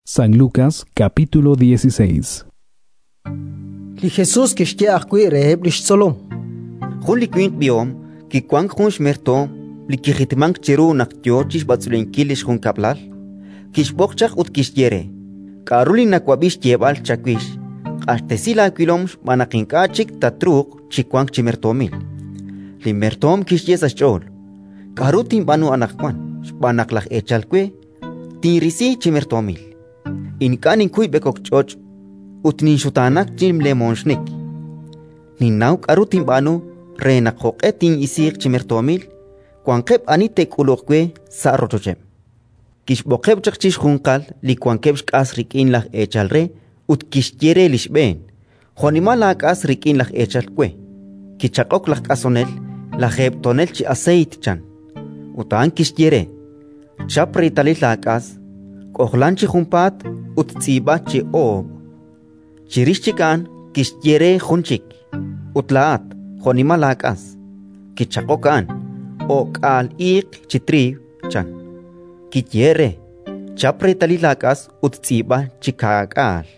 Li mertoom li kiwank xna'leb' Li Jesus kixye ajwi' reheb' li xtzolom: “Jun li winq b'ihom kiwank jun xmertoom li kijitmank chiru naq yo chi xb'atz'unlenkil li xjunkab'lal. Kixb'oq chaq ut kixye re: «K'aru li nawab'i xyeeb'al chawix? Q'axtesi laawilom xb'aan naq ink'a' chik tatruuq chi wank chi mertoomil». “Li mertoom kixye sa' xch'ool: «K'aru tinb'aanu anaqwan, xb'aan naq laj eechal we tinrisi chi mertoomil? Ink'a' ninkuy b'ekok ch'och' ut ninxutaanak chi lemooxnik. Ninnaw k'aru tinb'aanu re naq, jo'q'e tin'isiiq chi mertoomil, wanqeb' ani te'k'uluq we sa' rochocheb'». “Kixb'oqeb' chaq chixjunqal li wankeb' xk'as rik'in laj eechal re ut kixye re li xb'een: «Jo'nimal laak'as rik'in laj eechal we?». Kichaq'ok laj k'asonel: «Lajeeb' tonel chi aseeyt», chan. Ut a'an kixye re: «Chap reetalil laak'as, k'ojlan chi junpaat ut tz'iib'a chi oob'». Chirix chik a'an kixye re jun chik: «Ut laa'at, jo'nimal laak'as?». Kichaq'ok a'an: «O'k'aal iiq chi triiw», chan. Kiyehe'k re: «Chap reetalil laak'as ut tz'iib'a chi kaak'aal».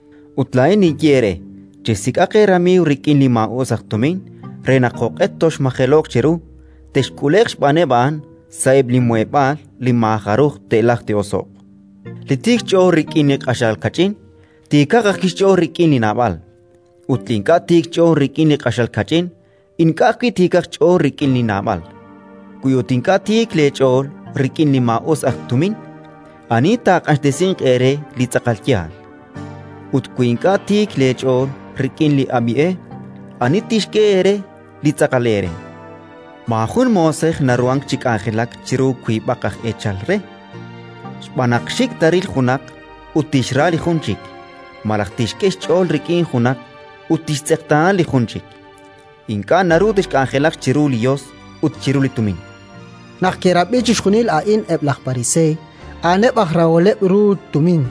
“Ut laa'in ninye eere: Chesik'aq eeramiiw rik'in li maa'us aj tumin re naq, jo'q'e toxmajelo'q cheru, texk'ule'q xb'aaneb' a'an sa'eb' li muheb'aal li maajaruj te'lajq te'oso'q. “Li tiik xch'ool rik'in li q'axal kach'in, tiikaq ajwi' xch'ool rik'in li naab'al; ut li ink'a' tiik xch'ool rik'in li q'axal kach'in, ink'a' ajwi' tiikaq xch'ool rik'in li naab'al. Wi ut ink'a' tiik leech'ool rik'in li maa'us aj tumin, ani taaq'axtesinq eere li tz'aqal yaal? Ut wi ink'a' tiik leech'ool rik'in li ab'i e, ani tixk'e eere li tz'aqal eere? “Maajun moosej naruhank chi k'anjelak chiru wiib'aq aj eechal re, xb'aan naq xik' taaril junaq ut tixra li jun chik, malaj tixk'e xch'ool rik'in junaq ut tixtz'eqtaana li jun chik. Ink'a' naru texk'anjelaq chiru li Yos ut chiru li Tumin”. Naq ke'rab'i chixjunil a'in eb' laj Pariseey, a'aneb' aj raholeb' ru li tumin,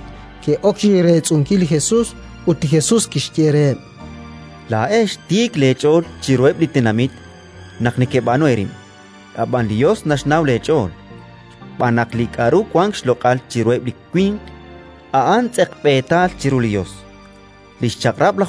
ke'ok chi reetz'unkil li Jesus. Ut li Jesus kixye reheb': “Laa'ex tiik leech'ool chiruheb' li tenamit naq nekeb'aanu eerib'. Ab'an li Yos naxnaw leech'ool, xb'aan naq li k'aru wank xloq'al chiruheb' li winq, a'an tz'eqb'eetal chiru li Yos. Li Chaq'rab'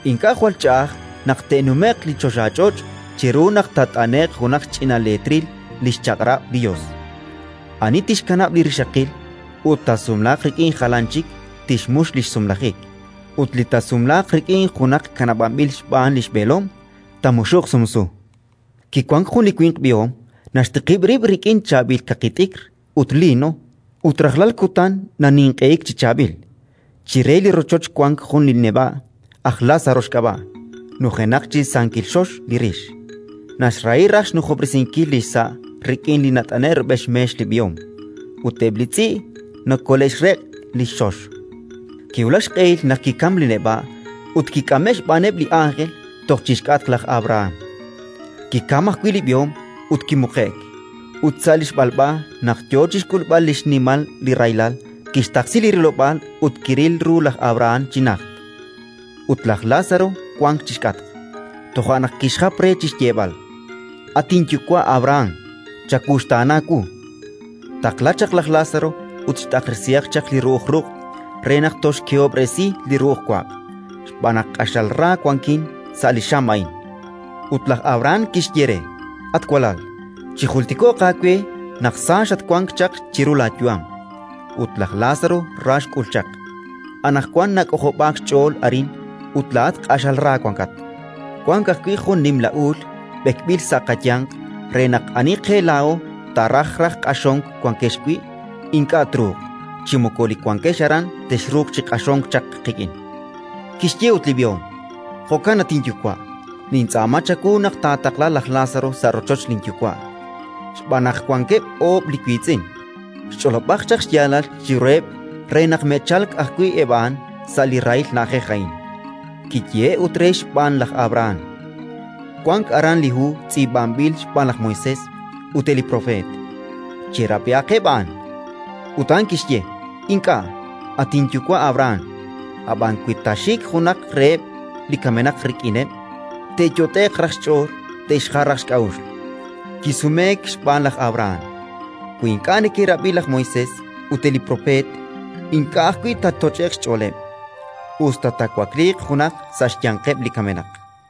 “Ink'a' jwal ch'a'aj naq te'nume'q li choxach'och' chiru naq taat'ane'q junaq xch'ina leetril li xChaq'rab' li Yos. “Ani tixkanab' li rixaqil ut taasumlaaq rik'in jalan chik tixmux li xsumlajik; ut li taasumlaaq rik'in junaq kanab'anb'il xb'aan li xb'eelom taamuxuq sumsu. “Kiwank jun li winq b'ihom, naxtiqib' rib' rik'in chaab'il kaqi t'ikr ut liino, ut rajlal kutan naninq'ehik chi chaab'il. Chire li rochoch wank jun li neb'a', aj Lázaro xk'ab'a', nujenaq chi sankil xox li rix: naxrahi raj xnujob'resinkil li xsa' rik'in li nat'ane'k rub'el xmeex li b'ihom. Ut eb' li tz'i' nakole'xreq' li xxox. “Kiwulak xq'ehil naq kikamk li neb'a' ut kik'ame'k xb'aaneb' li ánjel toj chi xk'atq laj Abraham. Kikam ajwi' li b'ihom ut kimuqe'k. “Ut sa' li xb'alb'a, naq yo chi xk'ulb'al xnimal li rahilal, kixtaqsi li rilob'aal ut kiril ru laj Abrahán chi najt, ut laj Lázaro wank chi xk'atq. Toja' naq kixjap re chi xyeeb'al: «At inyuwa' Abrahán, chawuxtaana wu! Taqla chaq laj Lázaro ut xt'aqresihaq chaq li ru'uj ruq' re naq tolxkehob'resi li ru'uj waq', xb'aan naq q'axal ra wankin sa' li xam a'in». “Ut laj Abrahán kixye re: «At walal, chijultiko'q aawe naq sa xatwank chaq chiru laayu'am, ut laj Lázaro ra xk'ul chaq. Anaqwan nak'ojob'aak xch'ool arin ut laa'at q'axal ra wankat. Wank ajwi' jun nimla uul b'ekb'il sa' qayanq, re naq ani qe laa'o taaraj raj q'axonk wankex wi' ink'a' truuq, chi moko li wankex aran texruuq chi q'axonk chaq qik'in». “Kixye ut li b'ihom: «Jo'kan, at inyuwa', nintz'aama chawu naq taqla laj Lázaro sa' rochoch linyuwa', xb'aan naq wankeb' oob' li wiitz'in: xch'olob'aq chaq xyaalal chiruheb' re naq me'chalk ajwi' eb' a'an sa' li rahil na'ajej a'in». Kiyehe'k ut re xb'aan laj Abrahán: «Wank aran li hu tz'iib'anb'il xb'aan laj Moisés ut eb' li propeet. Che'rab'ihaqeb' a'an». “Ut a'an kixye: «Ink'a', at inyuwa' Abrahán. Ab'an wi taaxik junaq reheb' li kamenaq rik'ineb', te'yot'e'q raj xch'ool te'xjal raj xk'a'uxl». Kisumeek xb'aan laj Abrahán: «Wi ink'a' neke'rab'i laj Moisés ut eb' li propeet, ink'a' ajwi' taatoch'e'q xch'ooleb', us ta taawakliiq junaq sa' xyanqeb' li kamenaq»”.